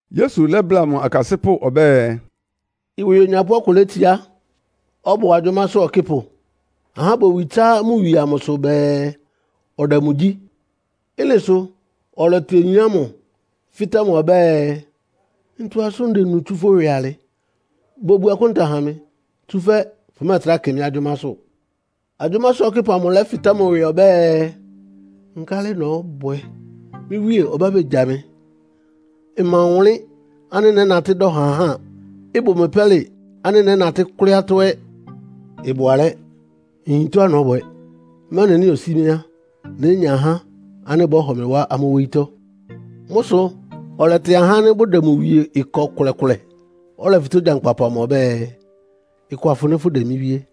Yesu lɛ́bláa mʋ akasɩ́pʋ́ ɔbɛ́ɛ, “Ɩwɩ onyapʋ́ ɔkʋ létsiá, ɔbʋ agyʋ́másʋ́ ɔkɩ́pʋ. Ahá bowi tsá mʋ wie amʋsʋ bɛɛ ɔdɛ mʋ gyí. Ɩ́nɩ sʋ ɔlɛtɩ oyin ámʋ, fɩ́tɛ́ mʋ ɔbɛ́ɛ, ‘Ntɔ asʋ́n ndenu tsú fʋ́ ɩwɩ alɩ? Bobu akúnta ha mɩ, tsúfɛ́ fʋmɛ́ɛtrá kɩ mɩ́ agyʋ́másʋ́.’ Agyʋ́másʋ́ ɔkɩ́pʋ amʋ lɛ́fɩtɛ́ mʋ ɩwɩ ɔbɛ́ɛ, ‘Nkálɩ nɔ́bwɛ? Mɩ́ wíe ɔbá begya mɩ. Mma ɔwʋnlɩ́n ánɩ́ nɛ́natɩ́ dɔ ha ahá. Ɩbʋ mɩ pɛ́lɩ ánɩ́ nɛ́natɩ́ kʋ́lɩ́ atɔ́ ɛ́. Ɩbʋ alɛ́! Nyin tɔ́á nɔ́bwɛ, mɛ́nɩ nɩ́ osí mɩ́ á, nénya ahá ánɩ́ bɔ́hɔ mɩ wá amʋ́ wóyítɔ́.’ “Mʋ́ sʋ ɔlɛtɩ ahá ánɩ́ bʋdɛ mʋ wie ɩkɔ kʋlɛkʋlɛ. Ɔlɛfɩtɛ́ ogyankpapʋ ɔbɛ́ɛ, ‘Ɩkɔ afɩnɩ fʋ́dɛ mɩ́ wíe?’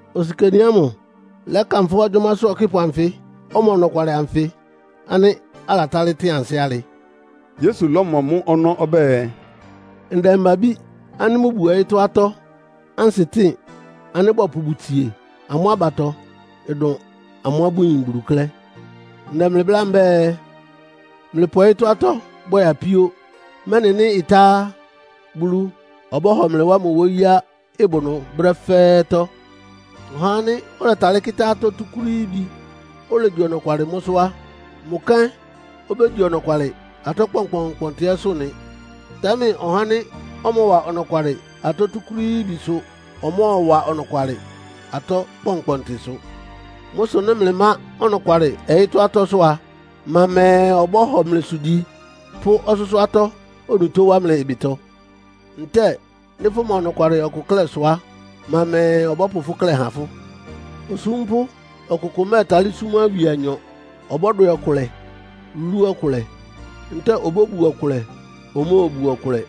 “Osikani ámʋ lɛ́kanfʋ́ agyʋ́másʋ́ ɔkɩ́pʋ anfɩ́ ɔma ɔnɔkwalɩ ánfɩ ánɩ́ alatálɩ́ tɩn ansɩ́ alɩ.” Yesu lɔ́mɔ mʋ́ ɔnɔ́ ɔbɛ́ɛ, “Ndɛmba-abí ánɩ́ bʋbuo ɔyɩ́tɔ́ atɔ́ ansɩtɩ́ɩn ánɩ́ bɔpʋ bʋtsie amʋ́ abatɔ ɩdʋn amʋ́á bʋyin Bulu klɛ́. “Ndɛ mlɩ bláa mbɛ́ɛ, mlɩpʋ ɔyɩ́tɔ́ atɔ́ bwɛ apíó, mɛ́nɩ nɩ́ ɩtá á, Bulu ɔbɔ́hɔ mlɩ wá mʋ wóyíá ɩbʋ ɩnʋ brɛ́ fɛ́ɛ́tɔ́. Ɔhá ánɩ́ ɔlɛtalɩ́ kɩ́tá atɔ́ túkúrííbi, olegyi ɔnɔkwalɩ mʋ́sʋ́ á, mʋ kɛ́n obégyi ɔnɔkwalɩ atɔ́ kpɔnkpɔntɩ ɛ́sʋ́ nɩ. Támɛ ɔhá ánɩ́ ɔmɔwa ɔnɔkwalɩ atɔ́ túkúrííbisʋ ɔmɔ́ɔwa ɔnɔkwalɩ atɔ́ kpɔnkpɔntɩsʋ. Mʋ́ sʋ nɩ́ mlɩmá ɔnɔkwalɩ ɔyɩ́tɔ́ atɔ́sʋ́ a, ma mɛɛ ɔbɔ́hɔ mlɩsʋ gyi, pʋ́ ɔsʋ́sʋ́ atɔ́ onutó wá mlɩ ɩbɩtɔ? Ntɛ́ɛ nɩ́ fʋma ɔnɔkwalɩ ɔkʋ klɛ́sʋ á, ma mɛɛ ɔbɔ́pʋ fʋ́ klɛ́ há fʋ́? “Osúmpʋ́ ɔkʋkʋ mɛ́ɛtalɩ́ súm awie anyɔ. Ɔbɔ́dwɛ ɔkʋlɛ, lú ɔkʋlɛ. Ntɛ́ɛ obóbu ɔkʋlɛ, omóobu ɔkʋlɛ.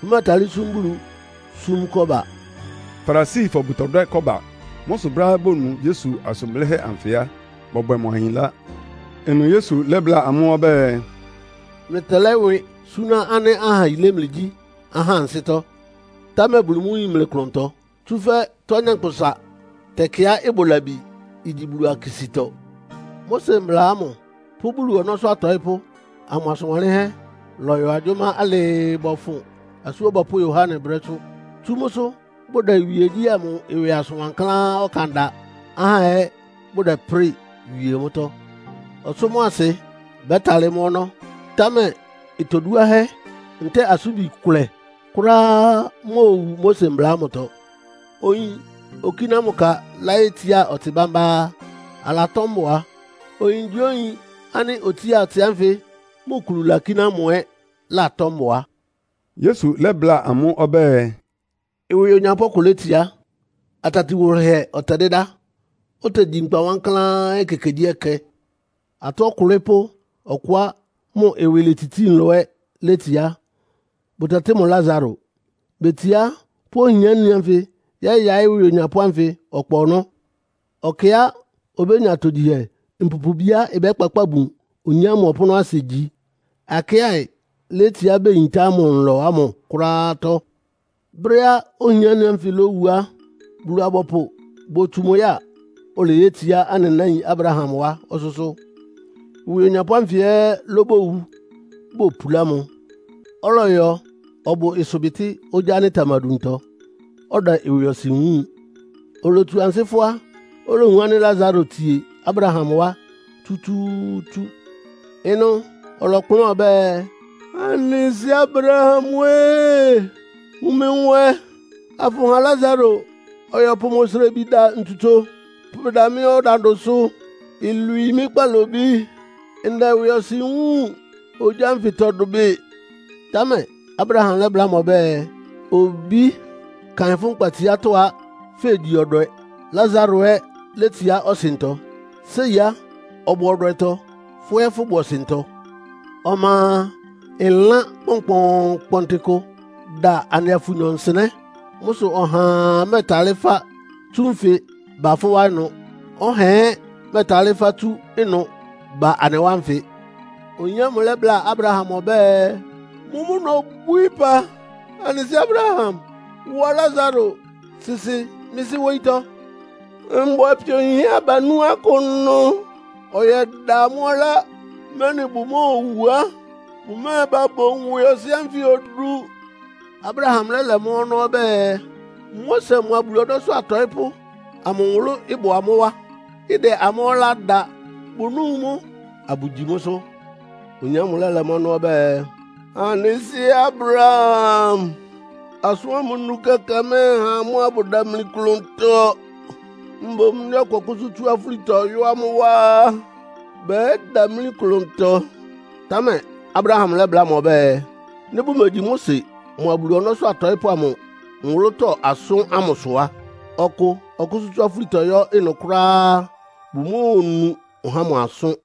Fʋmɛ́ɛtalɩ́ súm Bulu, súm Kɔ́ba.” Farisifɔ bʋtɔdwɛ́ kɔ́ba. Mʋ́ sʋ brɛ́á bonu Yesu asʋn blɩ́hɛ́ anfɩ á, bɔbwɛ mʋ ahinlá. Ɩnʋ Yesu lɛ́bláa amʋ́ ɔbɛ́ɛ, “Mlɩtɛlɛ́ ɩwɩ súná ánɩ́ aha yilé mlɩgyí ahá ansɩ́tɔ́, támɛ Bulu mʋ́ yin mlɩ klʋntɔ. Tsúfɛ́ tɔ́á nyankpʋsa tɛkɩá ɩbʋ labi igyi Bulu akisítɔ. “Mose Mbla ámʋ pʋ́ Bulu ɔnɔ́sʋ́ atɔɩ́pʋ́ amʋ asʋn wanlɩ́nhɛ́ lɔyɔ agyʋ́má alɩɩ bɔfʋn Asú Ɔbɔpʋ́ Yohane brɛ́sʋ́. Tsú mʋsʋ bʋdɛ Bulu iwíegyí ámʋ ɩwɩ asʋn wankláán ɔkan da, ahá ɛ́ bʋdɛprɩ́ɩ wie mʋ́tɔ́. Ɔsʋ́ mʋ́a asɩ bɛ́talɩ́ mɔ́ ɔnɔ́, támɛ itoduáhɛ́ ntɛ́ɛ asʋ́nbi ɩkʋlɛ kʋ́ráá móowu Mose Mbla ámʋtɔ. “Oyin okíná mʋ ka láyétsiá ɔtsɩ bámbá á, alatɔ́ mbʋa. Oyingyíoyin ánɩ́ otsía ɔtsɩ ánfɩ mʋ kulu lakíná mʋ ɛ́ latɔ́ mbʋa.” Yesu lɛ́bláa amʋ́ ɔbɛ́ɛ, “Ɩwɩ onyapʋ́ ɔkʋ létsiá. Atati wʋlɩhɛ ɔtɛdɩ́dá, otegyi nkpa wankláán ekekegyíɛkɛ. Atɔ́ ɔkʋ́lɩ́pʋ́ ɔkʋá mʋ ɩwɩ letsitsíí nlɔ ɛ́ létsiá. Bʋtɛtɩ́ mʋ Lasaro. Betsiá pʋ́ ohiáni ánfɩ yɛ́yaɩ́ ɩwɩ onyapʋ́ ámʋ ɔkpa ɔnɔ́. Ɔkɩá obénya atogyihɛ mpupubiá ɩbɛ́kpakpáa bun oyin ámʋ ɔpʋ́nʋ́asɩ gyi. Akɩ́aɩ létsiá beyintá mʋ nlɔ ámʋ kʋ́ráátɔ́. “Brɛ́á ohiáni ánfɩ lówu á, Bulu-abɔpʋ botsu mʋ ya, oleyétsiá anɩ náin Abraham wá ɔsʋ́sʋ́. Ɩwɩ onyapʋ́ ánfɩ ɛ́ lóbowu, bopulá mʋ. Ɔlɔyɔ ɔbʋ ɩsʋbɩtɩ́ ogyá ánɩ́ ɩtamaduntɔ, ɔdɛ ɩwɩɔsɩn wúun. Olotsu ansɩ́ fʋ́á, olowun ánɩ́ Lasaro tsie Abraham wá tsútsúútsú. Ɩnʋ ɔlɔkplʋ́n ɔbɛ́ɛ, ‘Anɩ sɩ́ Abraham-ée! Wun mɩ nwɛ, afʋha Lasaro ɔyɔpʋ mʋ osrebi da ntsutso pʋbɛda mɩ́ ɔdandʋsʋ, ilwii kpalobí. Ndɛ ɩwɩɔsɩn wúun ogyá ánfɩtɔ dʋbɩ!’ “Támɛ Abraham lɛ́bláa mʋ ɔbɛ́ɛ, ‘Obí, kaɩn, fʋ́ nkpatsiátɔ́ a, fegyi ɔdwɛ, Lasaro ɛ́ letsiá ɔsɩntɔ. Séi á, ɔbʋ ɔdwɛtɔ, fʋ́ ɛ́ fʋ́bʋ ɔsɩntɔ. Ɔma a, ɩlán kpɔnkpɔɔnkpɔntɩ kʋ da anɩa fʋnyɔ nsɩnɛ́. Mʋ́ sʋ ɔhaa mɛ́ɛtalɩ́ fá tsú nfɩ ba fʋ́ wá ɩnʋ, ɔhaa ɛ́ mɛ́ɛtalɩ́ fá tsú ɩnʋ ba anɩ wá nfɩ.’ Oyin ámʋ lɛ́bláa Abraham ɔbɛ́ɛ, ‘Mʋ́mʋ́ nobwíí ɩpa, anɩ sɩ́ Abraham, wa Lasaro sɩsɩ mɩ́ sɩ́ wóyítɔ́. Mbʋ apio yinhɛ́ abanú akʋ ɩnʋ, ɔyɛda amʋ́ ɔlá, mɛ́nɩ bowú á, bʋmɛ́ɛba bowun ɩwɩɔsɩn ánfɩ odu.’ “Abraham lɛ́lɛ mʋ́ ɔnɔ́ ɔbɛ́ɛ, ‘Mose mʋa Bulu ɔnɔ́sʋ́ atɔɩ́pʋ́ amʋ nwʋlʋ́ bʋ amʋ́ wá, ɩdɛ amʋ́ ɔlá da. Bʋnúu mʋ́, abʋgyi mʋ́sʋ́.’ Oyin ámʋ lɛ́lɛ mʋ́ ɔnɔ́ ɔbɛ́ɛ, ‘Anɩ sɩ́ Abraham, asʋ́n ámʋ nu kɛkɛ mɛ́ɛha amʋ́ abʋdamli klʋntɔ. Mboún nɩ́ ɔkʋ ɔkʋ́sʋ́ tsú afúlitɔ yɔ́ amʋ́ wá á, bɛ́damlí klʋntɔ.’ Támɛ Abraham lɛ́bláa mʋ ɔbɛ́ɛ, ‘Nɩ́ bʋmegyi Mose mʋa Bulu ɔnɔ́sʋ́ atɔɩ́pʋ́ amʋ nwʋlʋ́tɔ́ asʋ́n ámʋsʋ á, ɔkʋ ɔkʋ́sʋ́ tsú afúlitɔ yɔ́ ɩnʋ kʋ́ráá á, bʋmóonu ɔhá ámʋ asʋ́n.’”